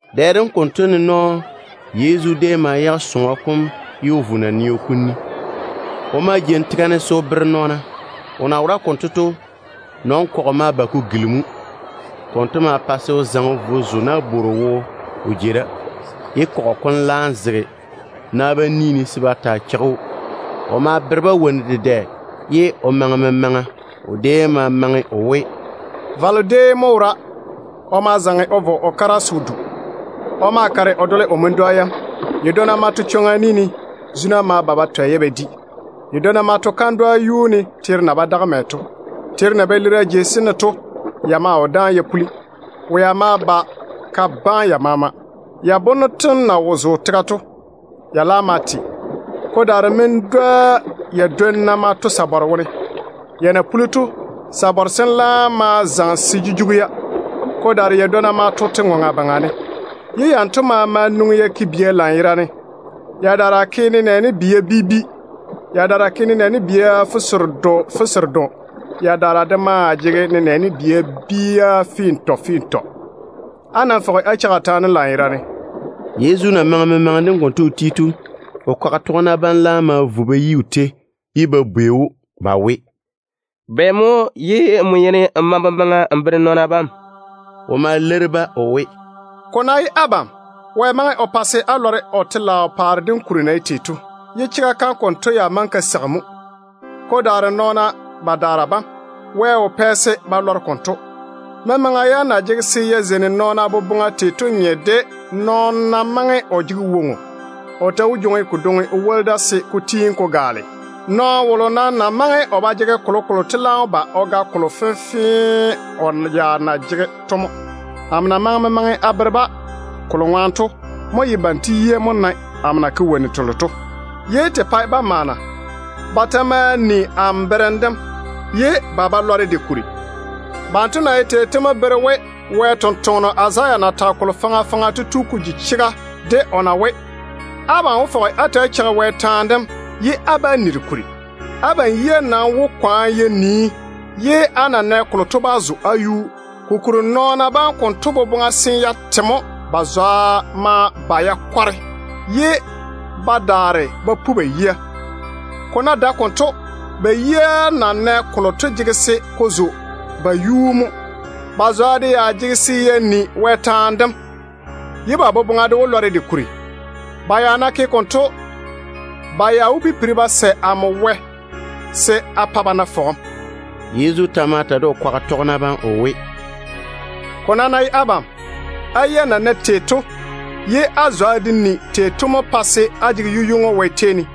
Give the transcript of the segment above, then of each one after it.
Dɛ dem konto ne nɔɔ Yezu déem ma yage sɔŋɔ kom o vo naneo kom ni. O ma jeini tega ne se o bere nɔɔna. O na wora konto to, nɔn-kɔgɔ ma ba ko gilimi‑o. Konto ma pa se o zaŋe o vo o zo nabworo wo o jei da, ye kɔgɔ kom laam zege na bam ni ne se ba taa cheigi‑o. O maa mae memaŋa o bere-ba wonnu dedɛ. O déem ma maŋe o we: “Valo déem mo wora. O ma zaŋe o vo o kara se o du. O ma kare o dole o wo-dwa yam. Yadwonna ma to chwoŋa ni ne. Zuna ma ba ba twɛ-ya ba di. Yadwonna ma to kandwa yuu ne mɛ teero na ba daga to. Teero na ba lira jei sem ne to, ya maa wo dáane ya puli. Wea ma ba ka baane ya maama. Ya bonno na wo zo tega to, ya ma te lela. Ko daare wo-dwa yadwonna ma to sabare wone. Ya na puli to, sabare sem laam ma zaŋe se che ya jira. Ko daare yadwonna ma to te-ŋoŋa baŋa ne, ye yanto maama nwoŋi ya ke bia lanyerane. Yadaara ke nenɛɛne bia bi bi. Yadaara ke nenɛɛne bia fuseredo fuseredo. Yadaara de maa jege nenɛɛne bia fintɔ fintɔ. Á nam fɔge á cheigi a taane dem lanyerane.” Yezu na maŋe memaŋe dem konto o ti to, o kwaga tɔgena bam laam ma vo ba yi o tei, ye ba bwei‑o ba we, “Bɛ mo ye n yeini n maŋe memaŋa n bere nɔɔna bam?” O ma leiri-ba o we, “Ko ná ye abam, Wɛ maŋe o pa se á lɔre o telaao paare dem kuri na ye tei to, ye chega kam konto ya maŋe ka seigi mo. Ko daare nɔɔna badaara bam, Wɛ wo pɛ-ba chwoŋa se ba lɔre o chega kam konto. Memaŋa yam na jege se ya zeini nɔɔna boboŋa tei to nye de nɔɔno ná maŋe o jege woŋo, o ta wó jwoŋi kodwoŋi o woli da se ko tiini ko gaale. Nɔɔno wolo nam na maŋe o ba jege kolokolo to laam wó ba o ga kolo fenfee o ya na jege to mo. Amo na maŋe memaŋa a bere-ba kolo ŋwaane to mo ye banto yia mo nae amo na ke wonnu telo to, ye te ba pae ba maana. Ba ta maa ni amo berem dem, ye ba ba lɔre de kuri. Banto na ye tei to mo bere we Wɛ sampwora Izaya na tage kolo faŋa faŋa to tu ko ji chega, de o na we: ‘Abam wó fɔge á ta‑á cheigi Wɛ taane dem, ye á bá ni de kuri. Abam yia nam wó kwaane ya nii ye á na nɛ kolo to bá zo á yuu. Kokuri nɔɔna bam konto boboŋa seene ya te mo. Ba zwa de ma kwareme, ye ba daare ba pu ba yia. Ko ná dae konto, ba yia na nɛ kolo to jege se ko zo ba yuu mo. Ba zwa de ya jege se ya ni Wɛ taane dem, ye ba boboŋa de wó lɔre de kuri. Ba ya ná ke konto, ba ya wó pipiri ba sɛ amo Wɛ se a pa ba na fɔgem.’” Yezu ta ma ta de o kwaga tɔgena bam o we, “Ko nam ná ye abam, á yia na nae tei to ye á zwa de ni tei to mo pae se á jege yu-ywoŋo Wɛ tei ne.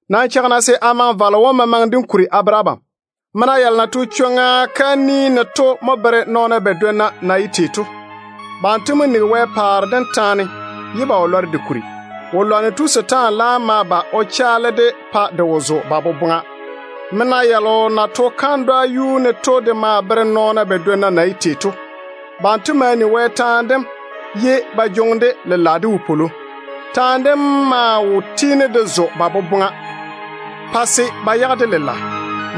Nam cheigi-na se a maŋe valo wom memaŋe dem kuri a bere abam. Wo-dwa yalo na to chwoŋa kam ni ne to mo bere nɔɔna badwonna na ye tei to. Banto mo nigi Wɛ paare dem taane, ye ba wo lɔre de kuri. Wo-lwanno tu setaane laam ma ba o chaale-de pa de wo zo ba boboŋa. Wo-dwa yalo na to kandwa yuu ne to de maa bere nɔɔna badwonna na ye tei to. Banto yeini ba ni Wɛ taane dem ye ba jwoŋi-de lela de wopwolo. Taane dem maa wo tiini de zo ba boboŋa, pa se ba yage-de lela.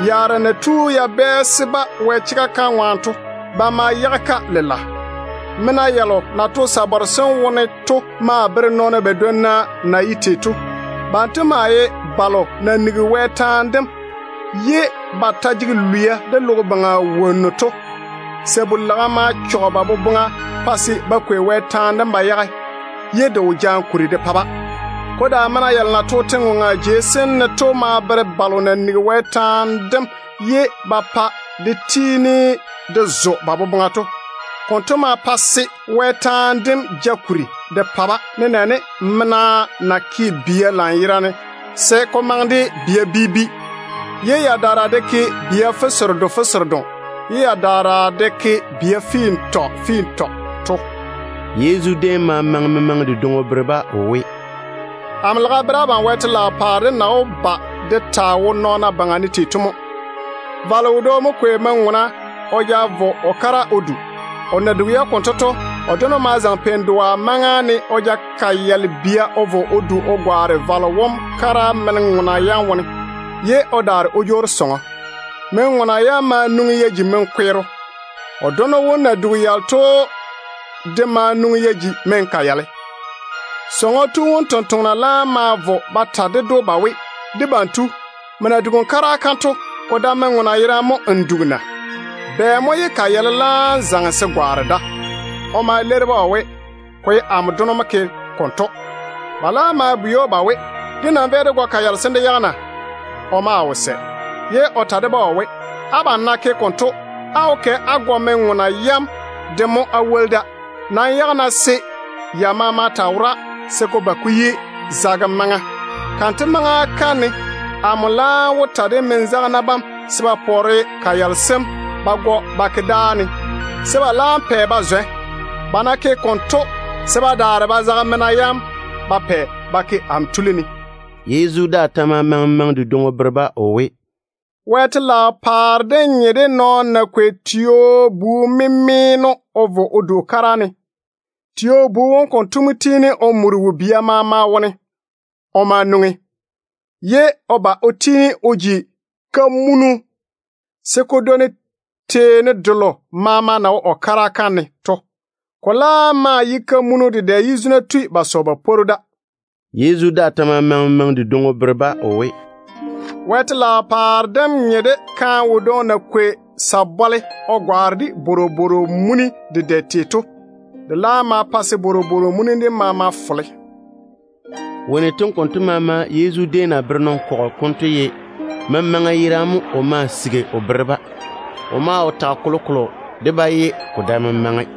Yaara na tu ya bɛɛse-ba Wɛ chega kam ŋwaane to, ba ma yage-ka lela. Wo-dwa yalo na to sabare sem wone to maa bere nɔɔna badwonna de na ye tei to. Banto ye balo na nigi Wɛ taane dem ye ba ta jege lwia de logo baŋa wonnu to. Sabu-laga ma chɔge ba boboŋa pa se ba kwei Wɛ taane dem ba yage, ye de wo jaane kuri de pa-ba. Ko daare wo-dwa yalo na to te-ŋoŋa jei sem ne to maa bere balo na nigi Wɛ taane dem ye ba pa de tiini de zo ba boboŋa to. Konto ma pa se Wɛ taane dem ja kuri de pa-ba, nenɛɛne mena na ke bia lanyerane se ko maŋe de bia bi bi, ye yadaara de ke bia fuseredo fuseredo, ye yadaara de ke bia fintɔ fintɔ to.” Yezu déem ma maŋe memaŋe dedwoŋi o bere-ba o we, “Amo lage a bere abam Wɛ telaao paare dem na wó ba de taa wo nɔɔna baŋa ne tei to mo. Valo wodwoŋi mo kwei men-ŋona o ja vo o kara o du. O na dugi-ya konto to, o dono ma zaŋe pein-dɔa maŋa ne o ja kayale bia o vo o du o gwaane valo wom kara men-ŋona yam wone, ye o daare o jwoori sɔŋɔ. Men-ŋona yam ma nwoŋi ya ji men-kweero. O dono wom na dugi yalo to ma nwoŋi ya ji men-kayale. Sɔŋɔ tu wom tontoŋena laam ma vo ba ta ded‑o ba we, ‘Debam tu, nmo na dugi n kara kam to, ko dae men-ŋona yerane mo n dugi na? Bɛ mo ye kayale laam zaŋe se gwaane da?’ O ma leiri-ba o we, ‘Ko ye amo dono mo ke konto.’ Ba laam ma bwei‑o ba we, ‘Dé nam véi dé gɔ kayale sem dé yage na?’ O maa wo sɛ, ye o ta de-ba o we, ‘Abam ná ke konto, á wó kɛ á gɔ men-ŋona yam de mo á woli da. Nam yage-na se ya maama taa wora se ko ba ko yi zagem maŋa. Kanto maŋa kam ne amo laam wó ta de men-zagena bam se ba pɔɔre kayale sem ba gɔ ba tiŋi dáa ne, se ba laam pɛ ba zwɛ. Ba ná ke konto, se ba daare ba zage mena yam ba pɛ ba ke amo tuli ne.’” Yezu daa ta ma maŋe memaŋe dedwoŋi o bere-ba o we, “Wɛ telaao paare dem nye de nɔɔno na kwei tio-bu-memeeno o vo o du o kara ne tei to mo. Tio-bu wom konto mo tiini o muri wo-bia maama wone. O ma nwoŋi, ye o ba o tiini o ji kamunu se ko dwoni dwo-vɔɔro telo maama na wo o kara kam ne to. Ko laam maa ye kamunu dedɛ ye zuna tui ba sɔ ba pworu ko yuu ne.” Yezu daa ta ma maŋe memaŋe dedwoŋi o bere-ba o we, “Wɛ telaao paare dem nye de kaane wodwoŋi na kwei sabɔle fenfee o gwaane de bworobworo mun-fɔrɔ tei to mo. De laam ma pa se bworobworo muni dem maama fole.” Wonnu tem konto maama Yezu déem na bere nɔn-kɔgɔ kom to ye memaŋa yerane mo o ma o bere-ba. O wo tage kolokolo de-ba ye ko dae memaŋe.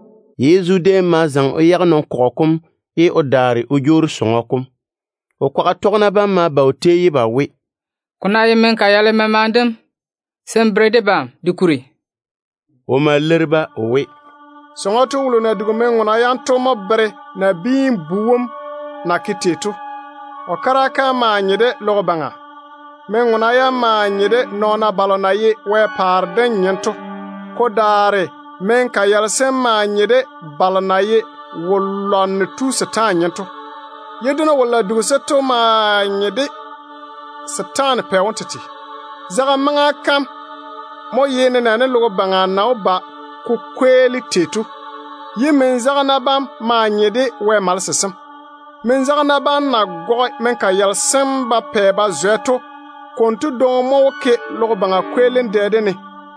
Yezu déem ma zaŋe o yage nɔn-kɔgɔ kom, ye o daare o jwoori sɔŋɔ kom. O kwaga tɔgena bam ma ba o tei ye ba we, “Ko ná ye men-kayale memaŋe dem, se n ta de kuri n bere debam.” O ma leiri-ba o we, “Sɔŋɔ tu wolo na dugi men-ŋona yam to mo bere Nabiin-bu wom na ke tei to. O kara kam maa nye de logo baŋa. Men-ŋona yam maa nye de Wɛ paare dem nɔɔna bam. Ko daare men-kayale sem maa nye de balo na ye wo-lwanno tu setaane nyem to, ye dono wolo na dugi-se to maa nye de setaana pɛ wom tete. Zagem maŋa kam mo bere logo baŋa na wó ba ko kweeli tei to. Men-zagena bam maa nye de Wɛ malese sem. Men-zagena bam na gɔge men-kayale sem ba pɛ ba zwɛ to, konto dwoŋi mo wó ke logo baŋa kweelim maŋa kam ne.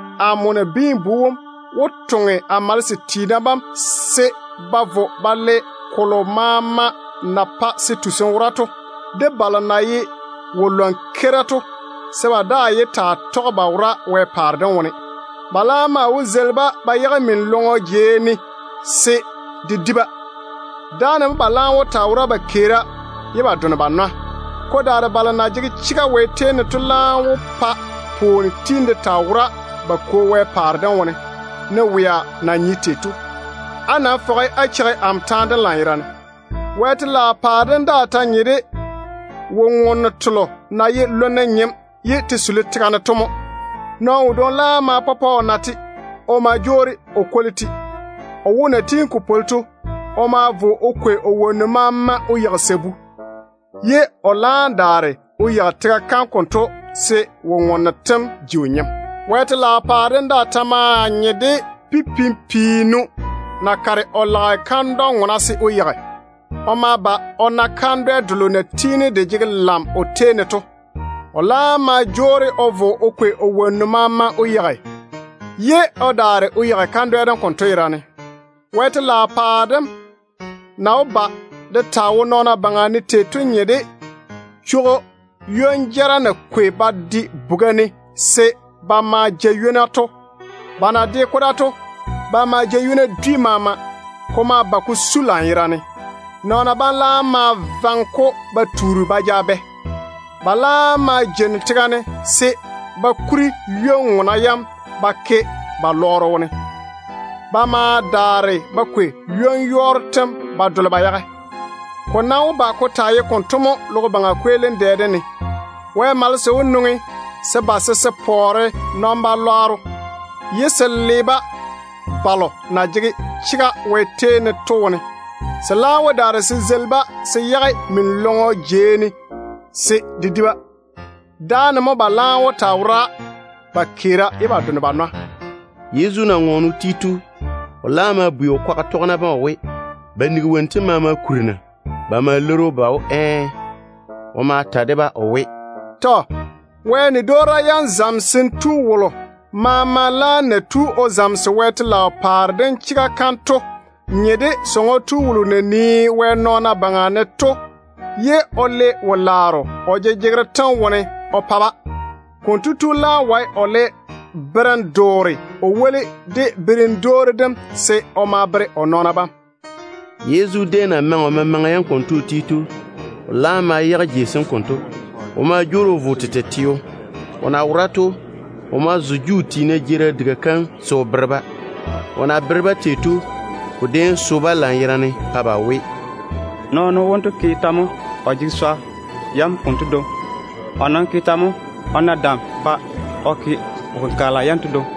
Amo Nabiin-bu wom wó toŋe a malese sem se ba vo ba le kolo maama na pae se tusim wora to, de balo na ye wo-lwan-keira to, se ba daa yé taa tɔge ba wora Wɛ paare dem wone. Ba laam maa wó zeili-ba ba yage min-lɔŋɔ jei ne se de di-ba. Dáane mo ba laam wó taa wora ba keera ye ba done ba nwa. Ko daare balo na jege chega Wɛ tei ne to laam wó pa pwooni tiini de taa wora ba Kwo Wɛ paare dem wone, ne wea na nye tei to. Á nam fɔge á cheigi amo taane dem lanyerane. Wɛ telaao paare dem daa ta nye de wo-ŋonno telo na ye lonne nyem ye te suli tega ne to mo. Nɔɔno wodwoŋi laam ma pɔpɔ o na-te. O ma jwoori o kwoli-te. O wo na tiini ko pwoli to, o ma vo o kwei o wonnu maama o yeigi sabu, ye o laam daare o yeigi tega kam konto se wo-ŋonno tem maama ji o nyem. Wɛ telaao paare dem daa ta maa nye de pipim-piinu na kare o lage kandwa-nyenno se o yeigi to mo. O ma ba o na kandwɛ delo na tiini de jege lam o tei ne to. O laam ma jwoori o vo o kwei o wonnu maama o yeigi, ye o daare o yeigi kandwɛ dem konto yerane se de taa ye o nyem. Wɛ telaao paare dem na wó ba de taa wo nɔɔna baŋa ne tei to nye de chwogo ywon-jara na kwei ba de buga ne se ba ma ja ywona to mo. Ba na de-ko da to, ba ma ja ywona dwi maama. Chwogo kom ma ba ko su lanyerane. Nɔɔna bam laam ma vaŋe-ko ba tuuri ba ja bɛ. Ba laam ma jeini tega ne se ba kuri ywon-ŋona yam ba ke ba lɔɔro wone. Ba ma daare ba kwei ywon-yɔɔro tem ba dole ba yage. Ko nam wó ba ko taa ye konto mo logo baŋa kweelim maŋa kam ne. Wɛ malese wó nwoŋi se ba se se pɔɔre nɔn-balwaaro ye se le-ba balo na jege chega Wɛ tei ne to wone. Se laam wó daare se zeili-ba se yage min-lɔŋɔ jei ne se de di-ba. Dáane mo ba laam wó taa wora ba keera ye ba done ba nwa.” Yezu na ŋɔɔne o ti to, o laam ma bwei o kwaga tɔgena bam o we, ba nigi wonnu tem maama kuri na? Ba ma leiri‑o ba we, ɛɛ. O ma ta de-ba o we, “Tɔ. Wɛ nia yam zamesem tu wolo maama laam na tu o zamese Wɛ telaao paare dem chega kam to nye de sɔŋɔ tu wolo na nii Wɛ nɔɔna baŋa ne ye o le wo-laaro o jejegero tem wone o pa-ba to. Konto tu laam wae o le berem-doore o woli de berem-dwoori dem se o ma o bere o nɔɔna bam.” Yezu déem na maŋe memaŋa yam konto o ti to, o laam ma yage jei sem konto. O ma jwoori o vo o tete teo. O na wora to, o ma zo Juu tiina jeerim diga kam se o bere-ba. O na bere-ba tei to, ko déem so-ba lanyerane, pa ba we, “Nɔɔno wonto ke tɛ mo o jege swa yam konto dwoŋi? O nam ke tɛ mo o na dam pa o ma o ke wo-kenkagela yanto dwoŋi?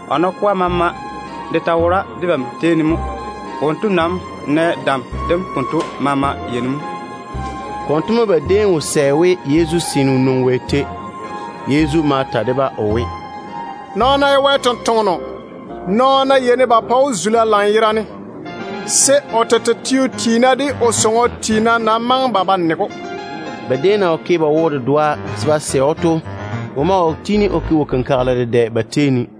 O nakɔa maama de ta wora debam tei ne mo. Wonto nam nɛ dam dem konto maama yei ne mo?” Konto mo ba boboŋa déem chɔge o ŋwaane. Yezu ma ta de-ba o we, “Nɔɔno ná ye Wɛ ni-jwoŋinu, nɔɔna yeini ba pa‑o zula lanyerane, ko daare o tete teo tiina de o sɔŋɔ tiina nam bá nege‑o.” Ba déem na wo ke ba wo-dedoa se ba sɛ‑o to, o maa wo tiini o ke wo-kenkagela dedɛ ba tei ne.